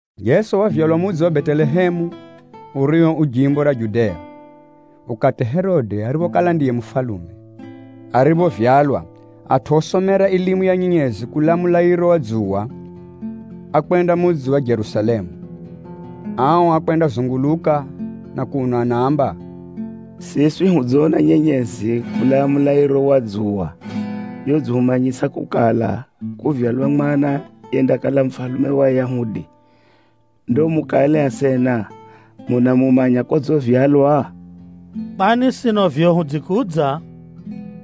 Jeso wavyalwa mudzi wa Betelehemu urio u jimbo ra Judea, ukati Herode ariphokala ndiye mufalume. Ariphovyalwa, atʼu osomera ilimu ya nyenyezi kulaa mulairo wa dzuwa, ákwenda mudzi wa Jerusalemu. Ao ákwendazunguluka na kuno anaamba, “Siswi hudzona nyenyezi kulaa mulairo wa dzuwa yodzihumanyisa kukala, kuvyalwa mwana yendakala mufalume wa Ayahudi. Ndo mukale asena, munamumanya kodzivyalwa? Kwani sino vivyo hudzikudza,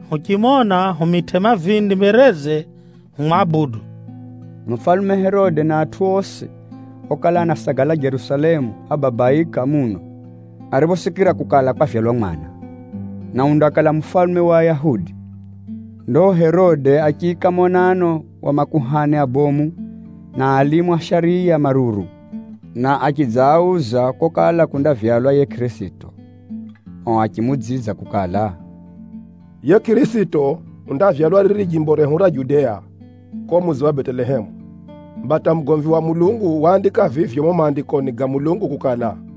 huchimona humitʼe mavindi mbereze humwabudu.” Mufalume Herode na atʼu osi okala anasagala Jerusalemu, ábabaika muno ariphosikira kukala kwavyalwa mwana, na undakala mufalume wa Ayahudi. Ndo Herode achiika monano wa makuhani abomu na alimu a shariya maruru, na achidzaauza kokala kundavyalwa yiye Kʼirisito. O achimuudzidza kukala, “Yiye Kʼirisito undavyalwa riri jimbo rehu ra Judea ko mudzi wa Betelehemu. Mba hata mugomvi wa Mulungu waandika vivyo mumo Maandikoni ga Mulungu kukala,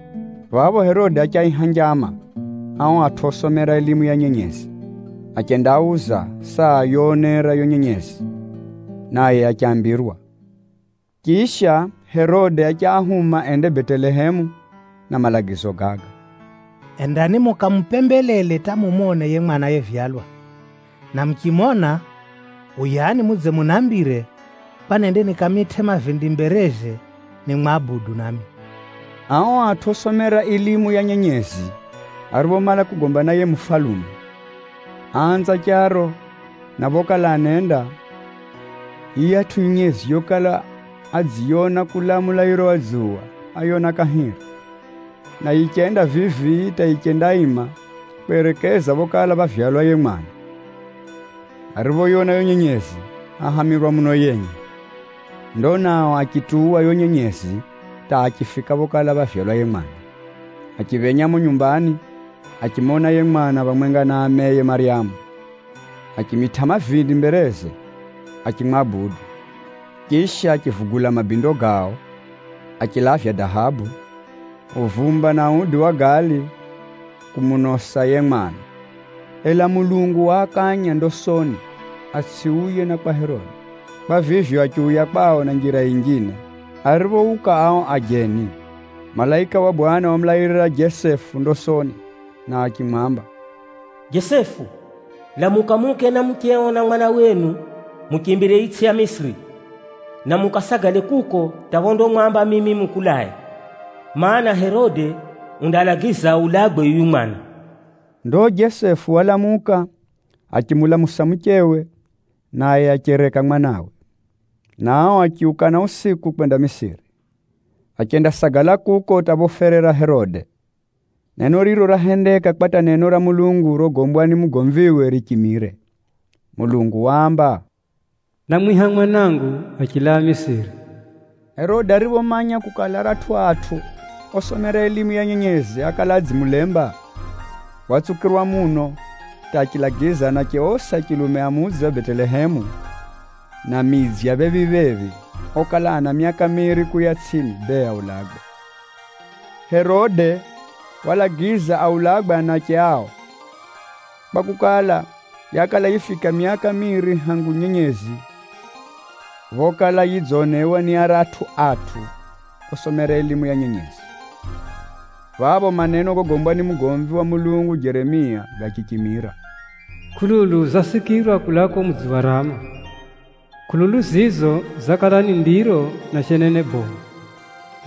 Phapho Herode achiaiha njama ao atʼu osomera ilimu ya nyenyezi, achendaauza saa yoonera yo nyenyezi, naye achambirwa. Chisha, Herode achiahuma ende Betelehemu na malagizo gaga, “Endani mukamupembelele hata mumone yiye mwana yevyalwa. Na muchimona, uyani mudze munambire, kwa nende nikamitʼe mavindi mbereze nimwabudu nami.” Ao atʼu osomera ilimu ya nyenyezi ariphomala kugomba na yiye mufalume, áanza charo, na phokala anenda, yiyatʼu nyenyezi yokala adziyona kulaa mulairo wa dzuwa, áyona kahiri, na yichenda vivi hata yichendaima kwerekeza phokala phávyalwa yiye mwana. Ariphoyona yo nyenyezi, áhamirwa muno yenye. Ndo nao achituwa yo nyenyezi hata achifika phokala phávyalwa yiye mwana. Achiphenya mumo nyumbani, achimona yiye mwana phamwenga na ameye Maryamu, achimitʼa mavindi mbereze, achimwabudu. Chisha, achivugula mabindo gao, achilavya dahabu, uvumba na udi wa gali kumunosa yiye mwana. Ela Mulungu waakanya ndosoni atsʼiuye na kwa Herode. Kwa vivyo, achiuya kwao na njira yinjine. Ariphouka ao ajeni, malaika wa Bwana wamulairira Jesefu ndosoni na achimwamba, “Jesefu, lamuka muuke na mucheo na mwana wenu muchimbirire itsʼi ya Misiri, na mukasagale kuko hata phondamwamba mimi mukulae, mana, Herode undalagiza aulagwe yuyu mwana.” Ndo Jesefu walamuka, achimulamusa muchewe, naye achereka mwanawe, na ao achiuka na usiku kwenda Misiri. Achendasagala kuko hata phoferera Herode. Neno riro rahendeka kwa hata neno ra Mulungu rogombwa ni mugomviwe richimire. Mulungu waamba, “Námwiha mwanangu kulaa Misiri.” Herode ariphomanya kukala, aratʼu atʼu osomera ilimu ya nyenyezi ákala adzimulemba, watsukirwa muno hata achilagiza anache osi a chilume a mudzi wa Betelehemu, na midzi ya phephi-phephi okala ana myaka miiri kuuya tsʼini, bee aulagwe. Herode walagiza aulagwe anache ao, kwakukala, yakala yifika myaka miiri hangu nyenyezi phokala yidzonewa ni aratʼu atʼu osomera ilimu ya nyenyezi. Phapho maneno gogombwa ni mugomvi wa Mulungu Jeremia gachichimira: “Kʼululu zasikirwa kulaa ko mudzi wa Rama, kʼululu za ndiro na shenene bomu.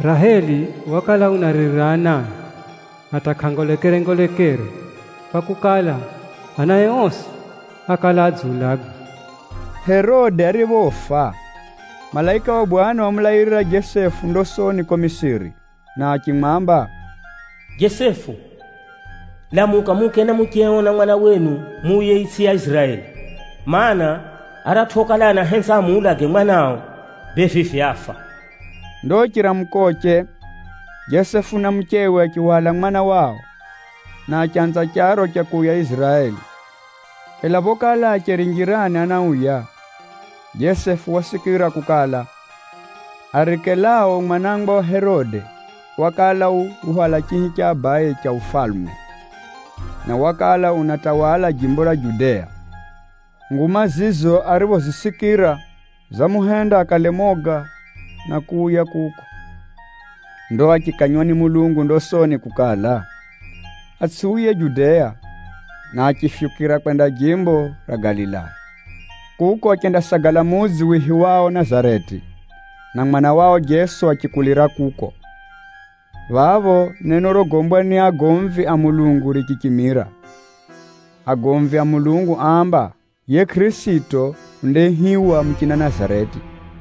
Raheli unaaririra anae, na unarema kunyamazwa, kwakukala, anae osi adziulagwa.” Herode ariphofa, malaika wa Bwana wamulairira Jesefu ndosoni ko Misiri, na achimwamba, “Jesefu, lamuka muuke na mucheo na mwana wenu muuye itsʼi ya Iziraeli. Maana, aratʼu okala anahenza amuulage mwanao, bee vivi áfa.” Ndo chiramukoche, Jesefu na muchewe achihwala mwana wao, na achanza charo cha kuuya Iziraeli. Ela phokala acheri njirani anauya, Jesefu wasikira kukala, Arikelao mwana wa Herode, wakala uhwala chihi cha abaye cha ufalume, na wakala unatawala jimbo ra Judea. Nguma zizo ariphozisikira, zamuhenda akale moga na kuuya kuko. Ndo achikanywa ni Mulungu ndosoni kukala, atsʼiuye Judea, na achifyukira kwenda jimbo ra Galilaya. Kuko achendasagala mudzi wihiwao Nazareti, na mwana wao Jeso achikulira kuko. Phapho, neno rogombwa ni agomvi a Mulungu richichimira. Agomvi a Mulungu áamba, yiye Kʼirisito undaihiwa muchina Nazareti.